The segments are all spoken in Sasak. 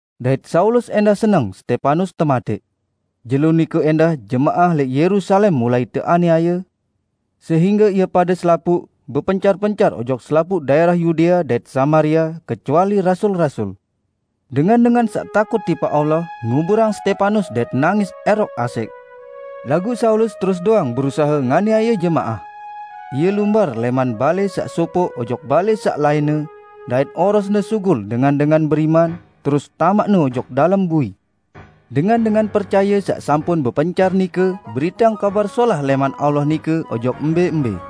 Dait Saulus ẽndah seneng Stepanus tematẽq. Jelo nike ẽndah jemaah lẽq Yerusalem mulai teaniaye, sehingge ie pade selapuq, bepencar-pencar ojok selapuq daẽrah Yudea dait Samaria kecuali rasul-rasul. Dengan-dengan saq takut tipaq Allah nguburang Stepanus dait nangis ẽroq asẽq. Laguq Saulus terus doang berusahe nganiaye jemaah. Ie lumbar lẽman balẽ saq sopoq ojok balẽ saq lainne, dait orosne sugul dengan-dengan beriman, terus tamaqne ojok dalem bui. Dengan-dengan percaye saq sampun bepencar nike beriteang Kabar Solah lẽman Allah nike ojok embẽ-embẽ.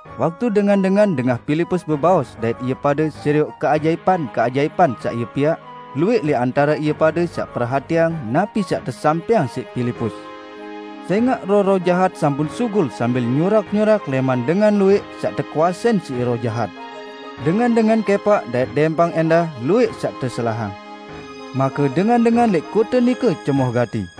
Waktu dengan-dengan dengah Pilipus bebaos dait ie pade serioq keajaipan-keajaipan saq ie piaq, luwẽq lẽq antare ie pade saq perhatiang napi saq tesampẽang siq Pilipus. Sẽngaq roh-roh jahat sampun sugul sambil nyurak-nyurak lẽman dengan luwẽq saq tekuasein siq roh jahat. Dengan-dengan kẽpaq dait dẽmpang ẽndah luwẽq saq teselahang. Make dengan-dengan lẽq kote nike cemoh gati.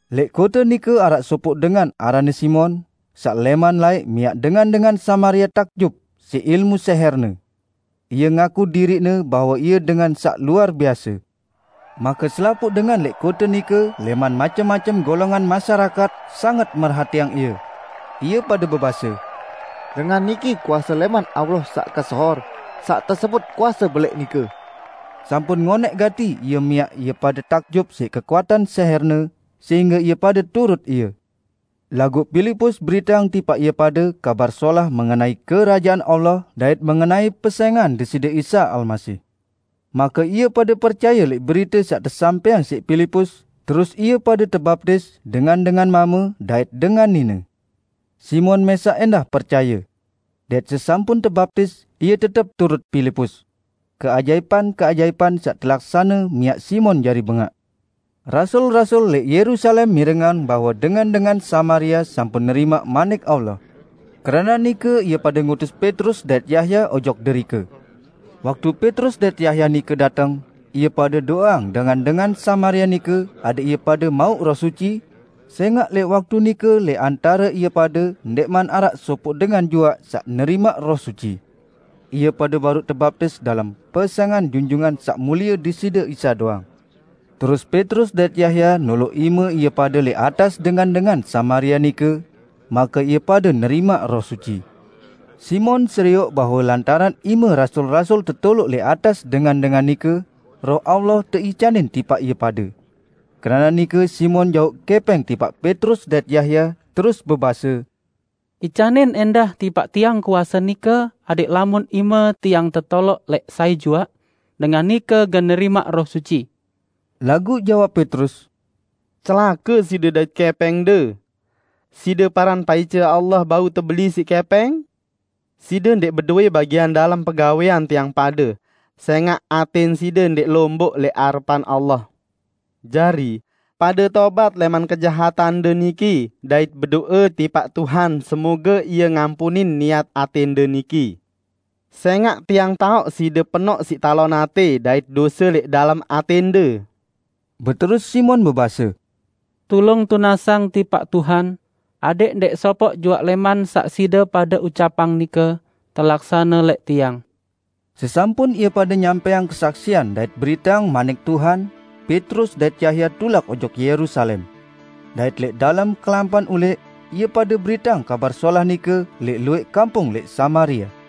Lẽq kote nike araq sopoq dengan aranne Simon, saq lẽman laẽq miaq dengan-dengan Samaria takjub siq ilmu sẽhẽrne. Ie ngaku diriqne bahwe ie dengan saq luar biase. Make selapuq dengan lẽq kote nike lẽman macem-macem golongan masyarakat sanget merhatiang ie. Ie pade bebase, "Dengan niki kuase lẽman Allah saq kesohor saq tesebut 'Kuase Belẽq' nike." Sampun ngonẽq gati ie miaq ie pade takjub siq kekuatan sẽhẽrne, sehingge ie pade turut ie. Laguq Pilipus beriteang tipaq ie pade Kabar Solah mengenai Kerajaan Allah dait mengenai pesẽngan Deside Isa Almasih. Make ie pade percaye lẽq berite saq tesampẽang siq Pilipus, terus ie pade tebaptis dengan-dengan mame dait dengan nine. Simon mẽsaq ẽndah percaye. Dait sesampun tebaptis, ie tetep turut Pilipus. Keajaipan-keajaipan saq telaksane miaq Simon jari bengaq. Rasul-rasul lẽq Yerusalem mirengang bahwe dengan-dengan Samaria sampun nerimaq Manik Allah. Keranaq nike ie pade ngutus Petrus dait Yahya ojok derike. Waktu Petrus dait Yahya nike dateng, ie pade do'eang dengan-dengan Samaria nike adẽq ie pade mauq Roh Suci, sẽngaq lẽq waktu nike lẽq antare ie pade ndẽqman araq sopoq dengan juaq saq nerimaq Roh Suci; ie pade baruq tebaptis dalem pesẽngan Junjungan Saq Mulie Deside Isa doang. Terus Petrus dait Yahya noloq ime ie pade lẽq atas dengan-dengan Samaria nike; make ie pade nerimaq Roh Suci. Simon serioq bahwe lantaran ime rasul-rasul tetoloq lẽq atas dengan-dengan nike, Roh Allah teicanin tipaq ie pade. Keranaq nike Simon jauq kẽpẽng tipaq Petrus dait Yahya, terus bebase, "Icanin ẽndah tipaq tiang kuase nike adẽq lamun ime tiang tetoloq lẽq sai juaq, dengan nike gen nerimaq Roh Suci." Laguq jawab Petrus, "Celake side dait kẽpẽngde! Side paran paice Allah bau tebeli siq kẽpẽng? Side ndẽq bedowẽ bagian dalem pegawẽan tiang pade, sẽngaq atẽn side ndẽq lomboq lẽq arepan Allah. Jari, pade tobat lẽman kejahatande niki dait bedo'e tipaq Tuhan semoge Ie ngampunin niat atẽnde niki. Sẽngaq tiang taoq side penoq siq talon atẽ dait dose lẽq dalem atẽnde." Beterus Simon bebase, "Tulung tunasang tipaq Tuhan adẽq ndẽq sopoq juaq lẽman saq side pade ucapang nike telaksane lẽq tiang." Sesampun ie pade nyampẽang kesaksian dait beriteang manik Tuhan, Petrus dait Yahya tulak ojok Yerusalem. Dait lẽq dalem kelampan ulẽq, ie pade beriteang Kabar Solah nike lẽq luwẽq kampung lẽq Samaria.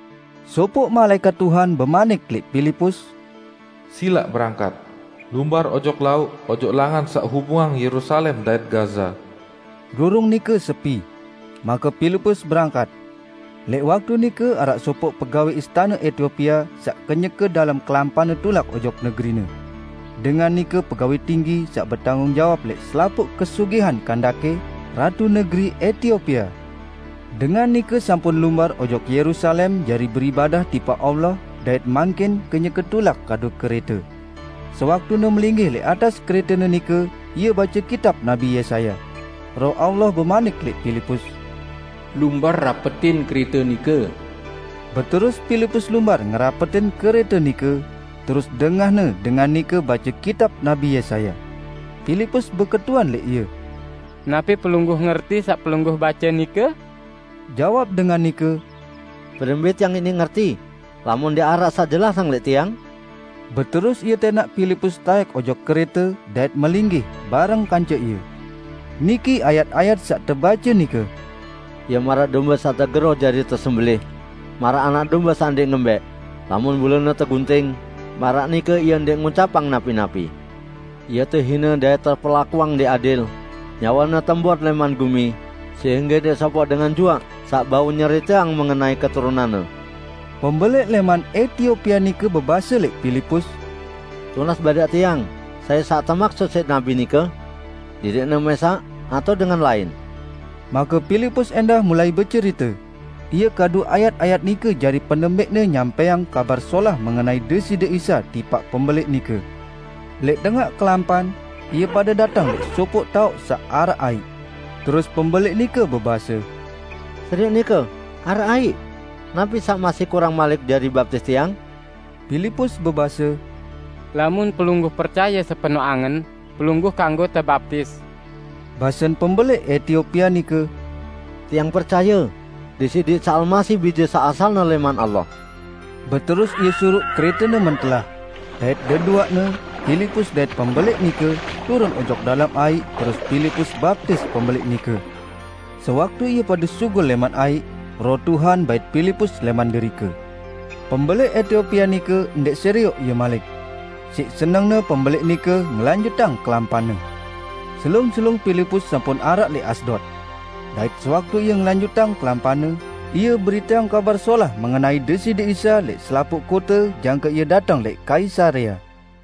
Sopoq malaẽkat Tuhan bemanik lẽq Pilipus, "Silaq berangkat! Lumbar ojok lauq ojok langan saq hubungang Yerusalem dait Gaza." Rurung nike sepi. Make Pilipus berangkat. Lẽq waktu nike araq sopoq pegawẽ istane Etiopia saq kenyeke dalem kelampanne tulak ojok negerine. Dengan nike pegawẽ tinggi saq betanggung jawab lẽq selapuq kesugihan Kandake, Ratu negeri Etiopia. Dengan nike sampun lumbar ojok Yerusalem jari beribadah tipaq Allah dait mangkin kenyeke tulak kadu kerẽte. Sewaktune melinggih lẽq atas kerẽtene nike ie bace kitab Nabi Yesaya. Roh Allah bemanik lẽq Pilipus, "Lumbar rapetin kerẽte nike." Beterus Pilipus lumbar ngerapetin kerẽte nike, terus dengahne dengan nike bace kitab Nabi Yesaya. Pilipus beketuan lẽq ie, "Napi pelungguh ngerti saq pelungguh bace nike?" Jawab dengan nike, "Berembẽ tiang iniq ngerti, lamun ndẽq araq saq jelasang lẽq tiang?" Beterus ie tẽnaq Pilipus taẽk ojok kerẽte dait melinggih bareng kance ie. Niki ayat-ayat saq tebace nike. "Ie maraq dombe saq tegeroh jari tesembelẽh, maraq anak dombe saq ndẽq ngembẽq, lamun bulune tegunting, maraq nike Ie ndẽq ngucapang napi-napi. Ie tehine dait teperlakuang ndẽq adil. Nyawe-Ne tembot lẽman gumi sehingge ndẽq sopoq dengan juaq saq bau nyeriteang mengenai keturunan-Ne." Pembelẽq lẽman Etiopia nike bebase lẽq Pilipus, "Tunas badaq tiang sai saq temaksut siq nabi nike? Diriqne mẽsaq atao dengan lain?" Make Pilipus ẽndah mulai becerite; ie kadu ayat-ayat nike jari penembẽqne nyampẽang Kabar Solah mengenai Deside Isa tipaq pembelẽq nike. Lẽq tengaq kelampan, ie pade dateng lẽq sopoq taoq saq araq aiq. Terus pembelẽq nike bebase, "Serioq nike, araq aiq! Napi saq masih kurang malik jari baptis tiang?" [ Pilipus bebase, "Lamun pelungguh percaye sepenoq angen, pelungguh kanggo tebaptis." Basen pembelẽq Etiopia nike, "Tiang percaye Deside Isa Almasih Bije saq asalne lẽman Allah."] Beterus ie suruq kerẽtene mentelah; dait deduaqne, Pilipus dait pembelẽq nike, turun ojok dalem aiq terus Pilipus baptis pembelẽq nike. Sewaktu ie pade sugul lẽman aiq, Roh Tuhan bait Pilipus lẽman derike. Pembelẽq Etiopia nike ndẽq serioq ie malik. Siq senengne pembelẽq nike ngelanjutang kelampanne. Selung-selung Pilipus sampun araq lẽq Asdod. Dait sewaktu ie ngelanjutang kelampanne, ie beriteang Kabar Solah mengenai Deside Isa lẽq selapuq kote jangke ie dateng lẽq Kaisarea.